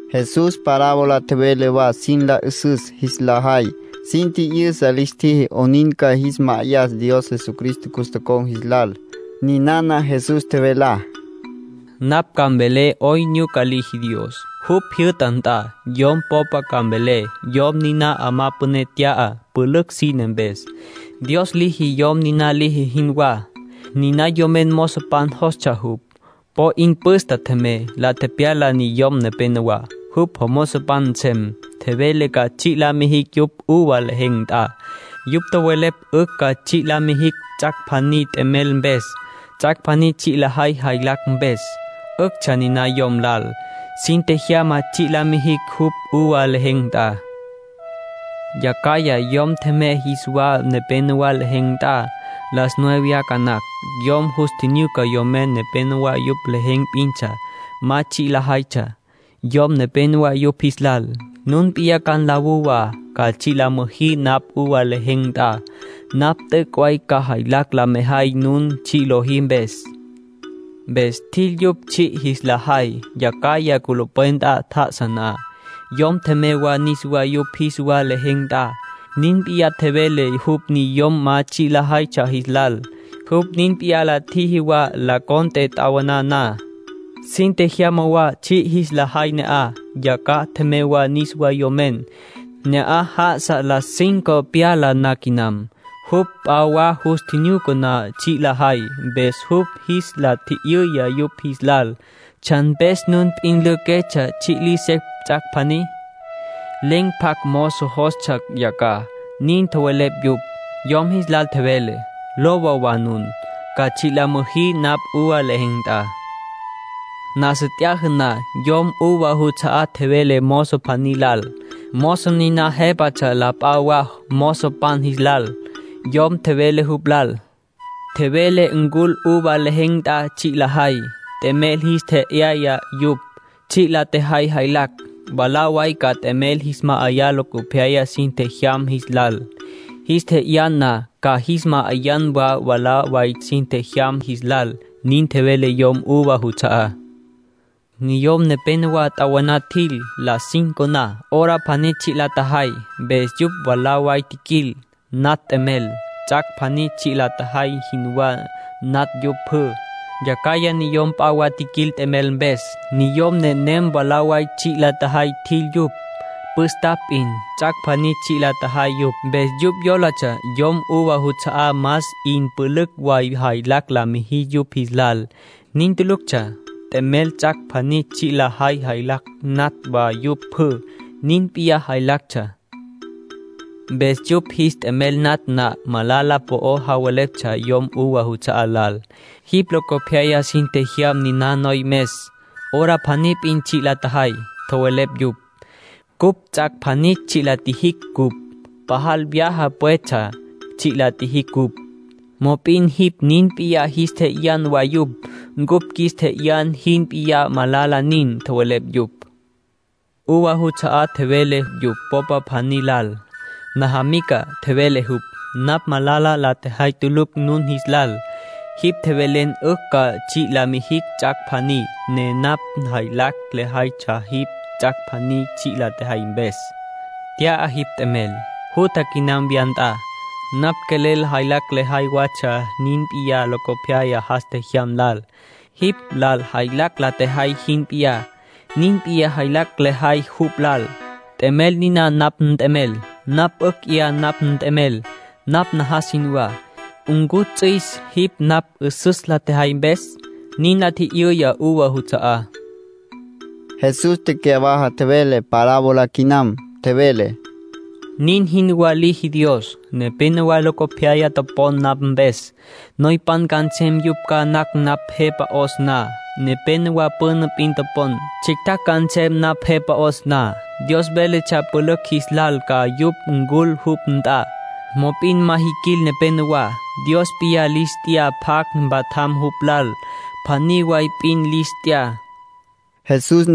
Jesús parábola tjevele wa sin la 'üsüs jis la jay. Sin tji'yüsa lis tjiji 'onin ca jis ma'ayas Dios Jesucristo cus tocon̈ jis lal. Ninana Jesús tjevelá: —Napj ca mvelé 'oyn nyuca liji Dios, jupj jyü'ta nt'a. Yom po'o ca mvelé. Yom niná 'amá püné tya'a, pülücj sine mpes. Dios liji yom niná liji jinwá. Niná yom mozopan jostsja jupj. Po 'in püstapj tjemey, la tepyala niyom nepenowá, jupj jomozopan nsem. Tjevele ca tsji' la mijicj jupj uva lejen̈ nt'a. Yupj tjowelepj 'ücj ca tsji' la mijicj ts'ac' pjaní t'emel mpes, ts'ac' pjaní tsji' lajay jaylacj mpes. 'Üctsja niná yom lal. Sin tjejyama tsji' la mijicj jupj uva lejen̈ nt'a. Yacjaya yom tjemey jis wa nepénowa lejen̈ nt'a. Las nueve ca nactsja. Yom yus tjinyuca niyom nepénowa yupj lejen̈ p'intsja, ma tsji' lajaytsja. Yom tjevele yupj jis lal: ‘Nun p'iyá ca nlawú wa, ca tsji' la müjí napj uva lejen̈ nt'a. Napj t'üc' way ca jaylacj la mejay nun tsji' lojí mpes.’ Mpes tjil yupj tsji' jis la jay. ”Yacjaya, culupwen nt'a tjá'asa na, yom tjemey wa niswá yupj jis wa lejen̈ nt'a. Nin p'iyá tjevele jupj niyom ma tsji' lajaytsja jis lal. Jupj nin p'iyá la tjiji wa las tres na, t'awaná. Sin tjejyama wa tsji' jis la jay ne'aj. Yacjaya tjemey wa niswá yomen. Ne'aj já'asa las cinco pyala na quinam. Jupj p'a wa yus tjinyuca ma tsji' lajay. Mpes jupj jis la tji'yüya yupj jis lal: ‘¿Tsjan mpes nun p'in lüjüquetsja, tsji' liji secj ts'ac' pjaní?’ ‘Len̈ pjacj mozo jostsja yacjaj’, nin tjowelepj yupj. Yom jis lal tjevele: ‘Lowa wa nun, ca tsji' la müjí napj uva lejen̈ nt'a’. ”Nasa t'yaja na, yom uva juts'a'á tjevele mozo pjaní lal. Mozo niná jépatsja la p'a wa mozopan jis lal. Yom tjevele jupj lal: ‘Tjevele ncul uva lejen̈ nt'a tsji' lajay. T'emel jis tje'yaya yupj, tsji' la tjajay jaylacj. Mwalá way ca t'emel jis ma'ayan locopyaya sin tjejyam jis lal. Jis tje'yan na, ca jis ma'ayan wa mwalá way sin tjejyam jis lal’, nin tjevele yom uva juts'a'á. ”Niyom nepénowa t'awaná tjil, las cinco na, hora pjaní tsji' la tjajay. Mpes yupj mwalá way tjiquil, natj t'emel. Ts'ac' pjaní tsji' la tjajay jinwá natj yupj pjü. Yacjaya niyom p'a wa tjiquil t'emel mpes. Niyom nenem mwalá way tsji' la tjajay tjil yupj, püstapj p'in. Ts'ac' pjaní tsji' la tjajay yupj, mpes yupj yólatsja yom uva juts'a'á más 'in pülücj way jaylacj la mijis yupj jis lal. Nin tuluctsja. T'emel ts'ac' pjaní tsji' lajay jaylacj natj wa yupj pjü. Nin p'iyá jaylactsja. Mpes yupj jis t'emel natj na, malala po'o javeleptsja yom uva juts'a'á lal. ‘Jipj locopyaya sin tjejyam niná noyomes. Hora pjaní p'in tsji' la tjajay’, tjowelepj yupj. ‘Cupj ts'ac' pjaní tsji' la tjijicj cupj. Pajal vyaja pwetsja tsji' la tjijicj cupj. Mop'in jipj nin p'iyá jis tje'yan wa yupj ncupj qjuis tje'yan jin p'iyá. Malala nin’, tjowelepj yupj. ”Uva juts'a'á tjevele yupj popa pjaní lal: ‘Najamica —tjevele jupj—, napj malala la tjejay tulucj nun jis lal. Jipj tjevelen 'ücj ca tsji' la mijin ts'ac' pjaní, ne napj jaylacj lejaytsja jipj ts'ac' pjaní tsji' la tjejay mpes. Nt'ya jipj t'emel. Jutja quinam wya nt'a. Napj quelel jaylacj lejay watsja nin p'iyá locopyaya jas tjejyam lal; jipj lal jaylacj la tjejay jin p'iyá, nin p'iyá jaylacj lejay jupj lal. T'emel niná napj nt'emel. Napj 'ücj 'ya napj nt'emel napj najas jinwá. ¿Ncu ts'üis jipj napj 'üsüs la tjejay mpes?’ nin la tji'yüya uva juts'a'á. Jesús tecyawaja tjevele parábola quinam. Tjevele: —Nin jinwá liji Dios. Nepénowa locopyaya topon napj mpes, noypan ca nsem yupj ca nacj napj Jepa 'os na. Nepénowa püna p'in topon, tsjictjacj ca nsem napj Jepa 'os na. Dios véletsja pülücj jis lal ca yupj ncul jupj nt'a, mop'in ma jiquil nepenowá. Dios p'iyá lis t'ya pjacj mpatjam jupj lal. Pjaní way p'in lis t'ya —nin tjevele Jesús.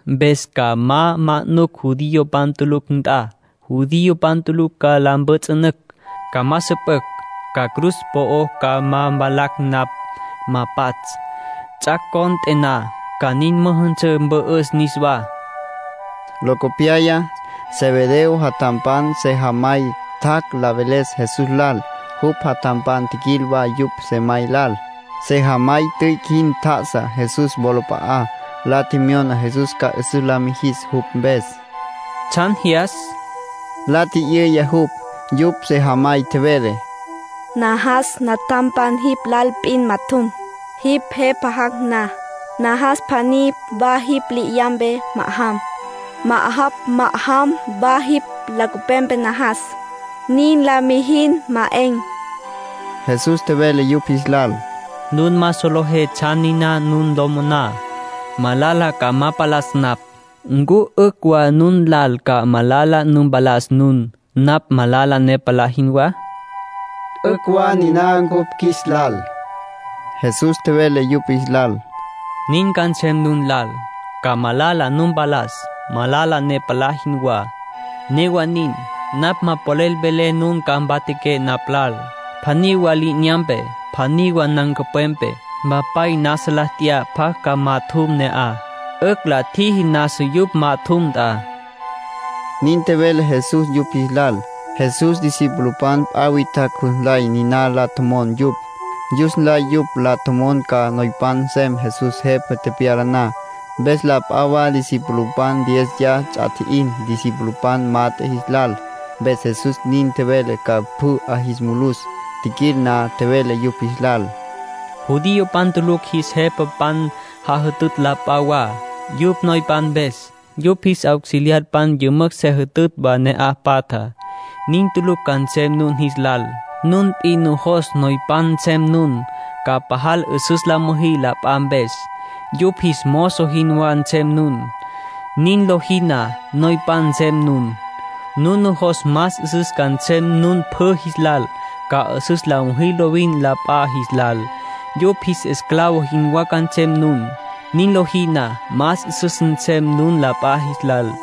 Mpes ca ma manucj judiopan tulucj nt'a. Judiopan tulucj ca la mpjüts'ünücj, ca ma süpücj. Ca cruz po'o ca ma valacj napj, ma pats'. Ts'ac' cont'e na, ca nin müjünsǘ, mpü'üs niswá”, nin tjevele Jesús. Locopyaya, Zebedeo jatjampan sejamay tjac' la veles Jesús lal. Jupj jatjampan tjiquil wa yupj sejamay lal. Sejamay tüic' jin tjá'asa Jesús wolap'a'á, la tjemyona Jesús ca 'üsüs la mijis jupj mpes. —¿Tsjan jyas? —la tji'yüya jupj. Yupj sejamay tjevele: —Najas natjampan jipj lal p'in majatjum, jipj Jepa jac' na. Najas pjaní wa jipj li'inyampe ma'ajam, ma'ajapj ma'ajam wa jipj nancupwepe najas. Nin la mijin, ma 'en —tjevele. Jesús tjevele yupj jis lal: —Nun ma solejé tsjan niná nun lo moná. Malala ca ma palas napj. ¿Ncu 'ücj wa nun lal ca malala nu mpalas nun, napj malala ne palá jinwá? —'Ücj wa niná cupj qjuis lal —nin tjowelepj yupj. Jesús tjevele yupj jis lal: —Nin ca nsem nun lal. Ca malala nu mpalas, malala ne palá jinwá. Newa nin, napj ma polel velé nun ca majatjaqué napj lal, pjaní wa li'inyampe, pjaní wa nancupwepe. Mpapay nasa la t'ya pjacj ca majatjum ne'aj. 'Ücj la tjiji nasa yupj majatjum nt'a —nin tjevele Jesús yupj jis lal. Jesús discipulopan p'a witjacj jus nlay niná la tjomon yupj. Jus nlay yupj la tjomon ca noypan nsem Jesús Jepa tepyala na. Mpes la p'a wa discipulopan diéziya ts'a tji'in discipulopan mat'e jis lal. Mpes Jesús nin tjevele ca pjü 'a jis mulus. Tjiquil na, tjevele yupj jis lal: —Judiopan tulucj jis jepapan jajütütj la p'a wa, yupj noypan mpes. Yupj jis auxiliarpan yümücj se jütütj wa ne'aj patjá. Nin tulucj ca nsem nun jis lal. Nun p'in nujos noypan nsem nun, ca pajal 'üsüs la müjí la p'a mpes. Yupj jis mozo jinwá nsem nun. Nin lojí na, noypan nsem nun. Nun nujos más 'üsüs ca nsem nun pjü jis lal, ca 'üsüs la müjí lovin la p'a jis lal. Yupj jis esclavo jinwá ca nsem nun. Nin lojí na, más 'üsüs nsem nun la p'a jis lal.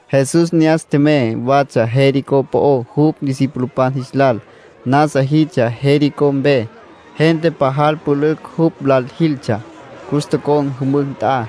Jesús ne'as tjemey watsja Jericó po'ó jupj discipulopan jis lal. Nasa jiltsja Jericó mpe. Gente pajal pülücj jupj lal jiltsja. Cus tocon̈ jümücj nt'a.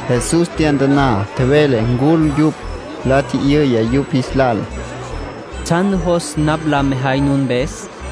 Jesús tyantaná. Tjevele ncul yupj. La tji'yüya yupj jis lal: —¿Tsjan nujos napj la mejay nun mpes?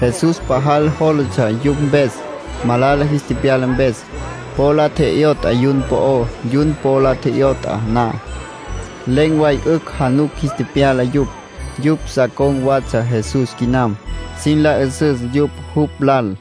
Jesús pajal jólatsja yupj mpes, malala jis tepyala mpes. Po la tje'yot'a yun po'ó. Yun po la tje'yot'a na, len̈ way 'ücj januc jis tepyala yupj. Yupj sa con̈ watsja Jesús quinam, sin la 'üsüs yupj jupj lal.